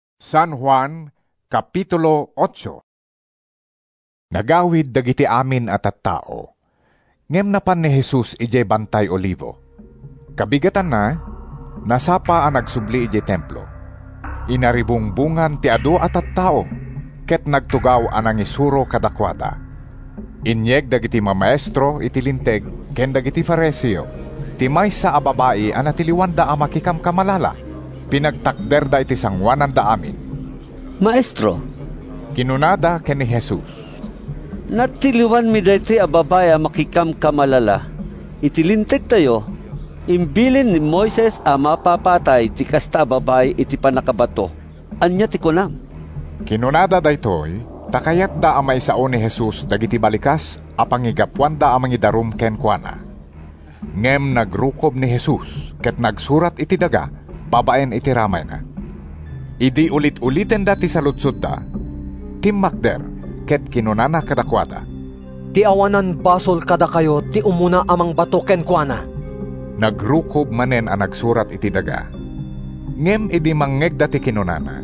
50a tawenmo?” Nagawid dagiti amin a tattao, ngem napan ni Jesus idiay Bantay Olivo. Kabigatanna, nasapa a nagsubli idiay Templo. Inaribungbongan ti adu a tattao ket nagtugaw a nangisuro kadakuada. Inyeg dagiti mamaestro iti Linteg ken dagiti Fariseo ti maysa a babai a natiliwanda a makikamkamalala. Pinagtakderda iti sangoananda amin. “Maestro,” kinunada ken ni Jesus, “natiliwanmi daytoy a babai a makikamkamalala. Iti Lintegtayo, imbilin ni Moises a mapapatay ti kasta a babai iti pannakabato. Ania ti kunam?” Kinunada daytoy ta kayatda a maisao ni Jesus dagiti balikas a pangigapuanda a mangidarum kenkuana. Ngem nagrukob ni Jesus ket nagsurat iti daga babaen iti ramayna. Idi ulit-ulitenda ti saludsodda, timmakder ket kinunana kadakuada, “Ti awanan basol kadakayo ti umuna a mangbato kenkuana.” Nagrukob manen a nagsurat iti daga. Ngem idi mangngegda ti kinunana,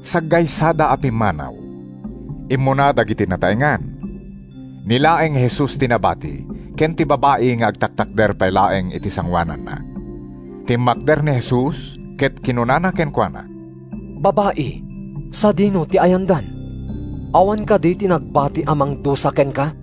saggaysada a pimmanaw. Immuna dagiti nataengan. Ni laeng Jesus ti nabati ken ti babai nga agtaktakder pay laeng iti sangoananna. Timmakder ni Jesus ket kinunana kenkuana, “Babai, sadino ti ayandan? Awan kadi ti nagbati a mangdusa kenka?”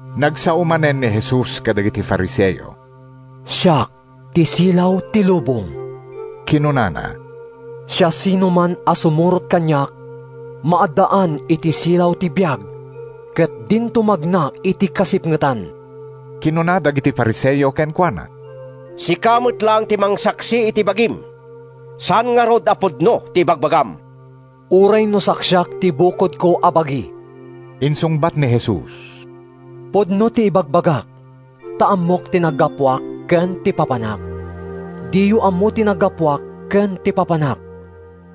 Nagsao manen ni Jesus kadagiti Fariseo, “Siak ti silaw ti lubong,” kinunana. “Siasinoman a sumurot kaniak maaddaan iti silaw ti biag, ket dinto magna iti kasipngetan.” Kinuna dagiti Fariseo kenkuana, “Sika met laeng ti mangsaksi iti bagim. Saan ngarud a pudno ti ibagbagam.” “Uray no saksiak ti bukodko a bagi,” insungbat ni Jesus, “pudno ti ibagbagak ta ammok ti naggapuak ken ti papanak. Diyo ammo ti naggapuak ken ti papanak.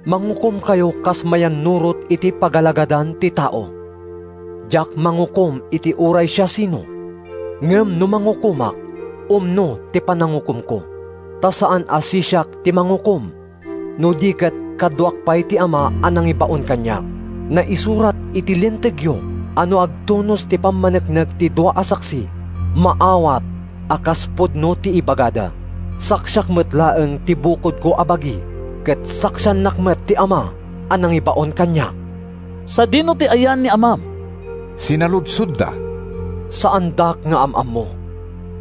Mangukomkayo kas mayannurot iti pagalagadan ti tao. Diak mangukom iti uray siasino. Ngem no mangukomak, umno ti panangukomko, ta saan a sisiak ti mangukom no di ket kaduak pay ti Ama a nangibaon kaniak. Naisurat iti Lintegyo a no agtunos ti pammaneknek ti dua a saksi, maawat a kas pudno ti ibagada. Saksiak met laeng ti bukodko a bagi, ket saksiannak met ti Ama a nangibaon kaniak.” “Sadino ti ayan ni amam?” sinaludsodda. “Saandak nga am-ammo,”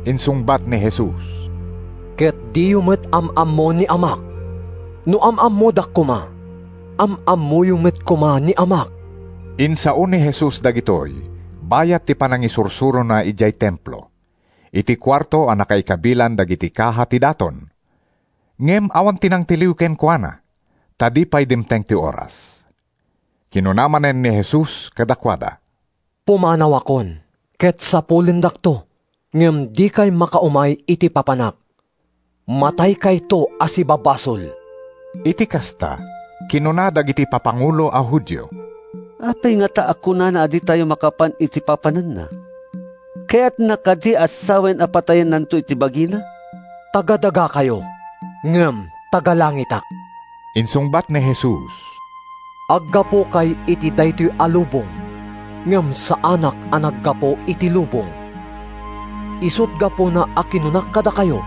insungbat ni Jesus, “ket diyo met am-ammo ni Amak. No am-ammodak koma, am-ammoyo met koma ni Amak.” Insao ni Jesus dagitoy bayat ti panangisursurona idiay Templo, iti kuarto a nakaikabilan dagiti kaha ti daton. Ngem awan ti nangtiliw kenkuana, ta di pay dimteng ti oras. Kinuna manen ni Jesus kadakuada, “Pumanawakon, ket sapulendakto, ngem dikay makaumay iti papanak. Mataykayto a sibabasol.” Iti kasta, kinuna dagiti papangulo a Judio, “Apay ngata a kunana a ditayo makapan iti papananna? Kayatna kadi a sawen a patayennanto ti bagina?” “Taga-dagakayo, ngem taga-langitak,” insungbat ni Jesus. “Aggapukay iti daytoy a lubong, ngem saanak a naggapu iti lubong. Isut’ gapuna a kinunak kadakayo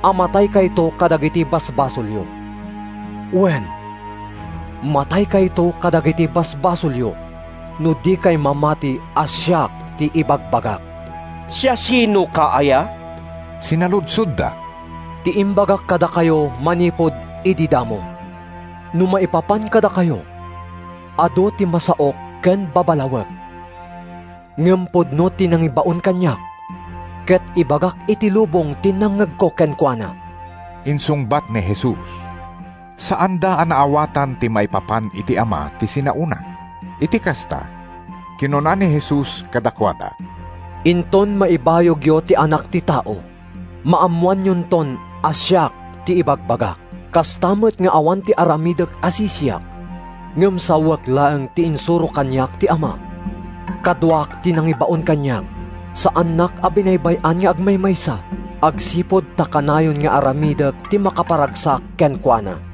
a mataykayto kadagiti basbasolyo. Wen, mataykayto kadagiti basbasolyo no dikay mamati a ‘Siak’ ti ibagbagak.” “Siasinoka aya?” sinaludsodda. “Ti imbagak kadakayo manipud idi damo. No maipapan kadakayo, adu ti masaok ken babalawek. Ngem pudno ti nangibaon kaniak, ket ibagak iti lubong ti nangngegko kenkuana,” insungbat ni Jesus. Saanda a naawatan a maipapan iti Ama ti sinaona. Iti kasta, kinuna ni Jesus kadakuada, “Inton maibayogyo ti Anak ti Tao, maammoanyonton a ‘Siak’ ti ibagbagak. Kasta met nga awan ti aramidek a sisiak, ngem sawek laeng ti insuro kaniak ti Ama. Kaduak ti nangibaon kaniak. Saannak a binaybay-an nga agmaymaysa, agsipud ta kanayon nga aramidek ti makaparagsak kenkuana.”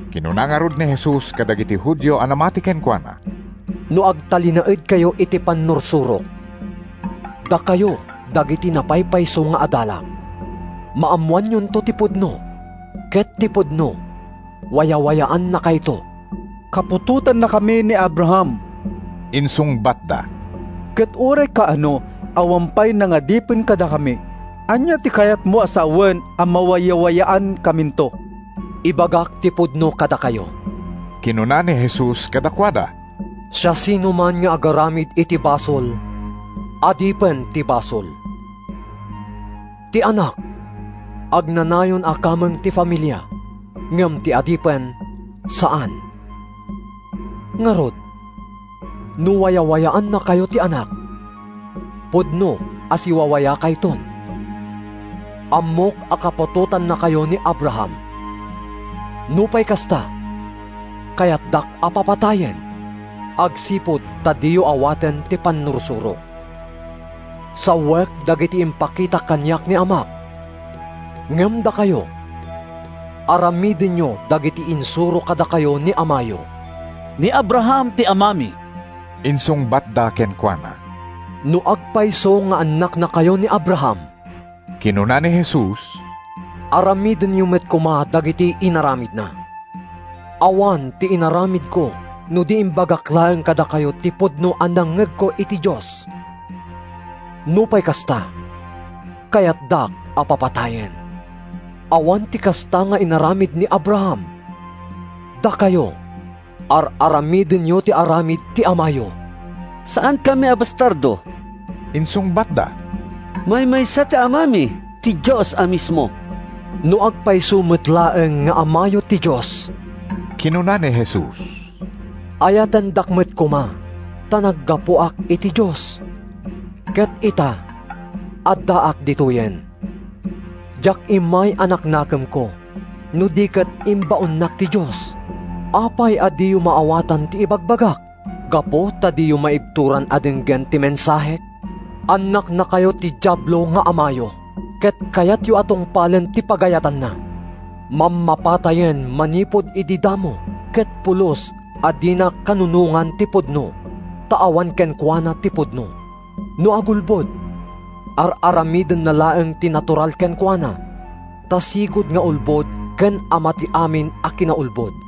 Kinuna ngarud ni Jesus kadagiti Judio a namati kenkuana, “No agtalinaedkayo iti pannursurok, dakayo dagiti napaypayso nga adalak. Maammoanto ti pudno, ket ti pudno wayawayaannakayto.” “Kaputotannakami ni Abraham,” insungbatda. “Ket uray kaano, awan pay nangadipen kadakami. Ania ti kayatmo a sawen a mawayawayaankaminto?” “Ibagak ti pudno kadakayo,” kinuna ni Jesus kadakuada. “Siasinoman nga agaramid iti basol, adipen ti basol. Ti anak agnanayon a kameng ti familia, ngem ti adipen saan. Ngarud, no wayawayaannakayo ti Anak, pudno a siwawayakayton. Ammok a kaputotannakayo ni Abraham. Nupay kasta, kayatdak a papatayen, agsipud ta diyo awaten ti pannursurok. Sawek dagiti impakita kaniak ni Amak, ngem dakayo, aramidenyo dagiti insuro kadakayo ni amayo.” “Ni Abraham ti amami,” insungbatda kenkuana. “No agpayso nga annaknakayo ni Abraham,” kinuna ni Jesus, “aramidenyo met koma dagiti inaramidna. Awan ti inaramidko no di imbagak laeng kadakayo ti pudno a nangngegko iti Dios. Nupay kasta, kayatdak a papatayen. Awan ti kasta nga inaramid ni Abraham. Dakayo, ar-aramidenyo ti aramid ti amayo.” “Saankami a bastardo,” insungbatda. “Maymaysa ti Amami, ti Dios a mismo.” “No agpayso met laeng nga amayo ti Dios,” kinuna ni Jesus, “ayatendak met koma; ta naggapuak iti Dios, ket ita, addaak ditoyen. Diak immay a naknakemko, no di ket imbaonnak ti Dios. Apay a diyo maawatan ti ibagbagak? Gapu ta diyo maibturan a denggen ti mensahek? Annaknakayo ti Diablo nga amayo, ket kayatyo a tungpalen ti pagayatanna. Mammapatayen manipud idi damo ket pulos a dina kanunongan ti pudno, ta awan kenkuana ti pudno. No agulbod, ar-aramidenna laeng ti natural kenkuana ta sigud nga ulbod ken ama ti amin a kinaulbod.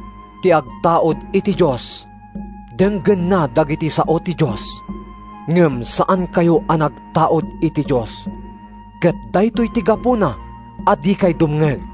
Ti agtaud iti Dios, denggenna dagiti sao ti Dios. Ngem saankayo a nagtaud iti Dios, ket daytoy ti gapuna a dikay dumngeg.”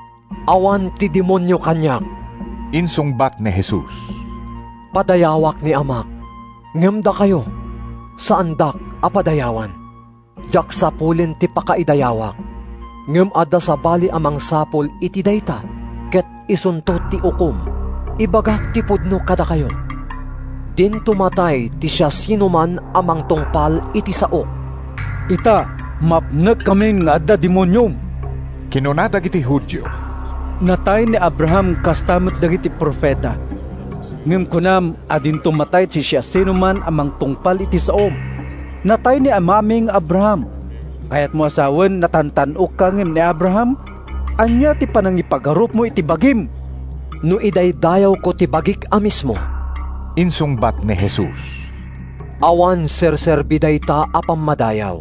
“Awan ti demonio kaniak,” insungbat ni Jesus. “Padayawak ni Amak, ngem dakayo, saandak a padayawan. Diak sapulen ti pakaidayawak. Ngem adda sabali a mangsapul iti dayta ket isunto ti ukom. Ibagak ti pudno kadakayo: Dinto matay ti siasinoman a mangtungpal iti saok.” “Ita, mapnekkamin nga adda demoniom!” kinuna dagiti Judio. “Natay ni Abraham kasta met dagiti profeta, ngem kunam a dinto matay ti siasinoman a mangtungpal iti saom. Natay ni Amami nga Abraham. Kayatmo a sawen a natantan-okka ngem ni Abraham? Ania ti panangipagarupmo iti bagim?” “No idaydayawko ti bagik a mismo,” insungbat ni Jesus, “awan serserbi dayta a pammadayaw.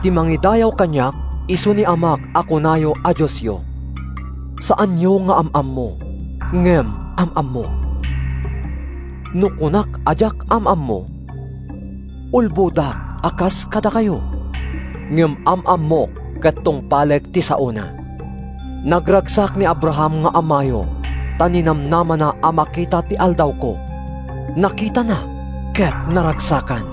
Ti mangidayaw kaniak isu ni Amak a kunayo a Diosyo. Saanyo nga am-ammo, ngem am-ammok. No kunak a diak am-ammo, ulbodak a kas kadakayo. Ngem am-ammok ket tungpalek ti saona. Nagragsak ni Abraham nga amayo ta ninamnamana a makita ti aldawko; nakitana ket naragsakan.”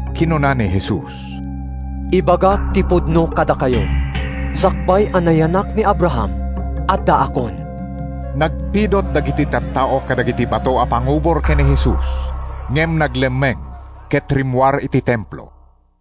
Kinuna ni Jesus, “Ibagak ti pudno kadakayo: Sakbay a nayanak ni Abraham, addaakon.” Nagpidut dagiti tattao kadagiti bato a pangubor ken ni Jesus, ngem naglemmeng ket rimmuar iti Templo.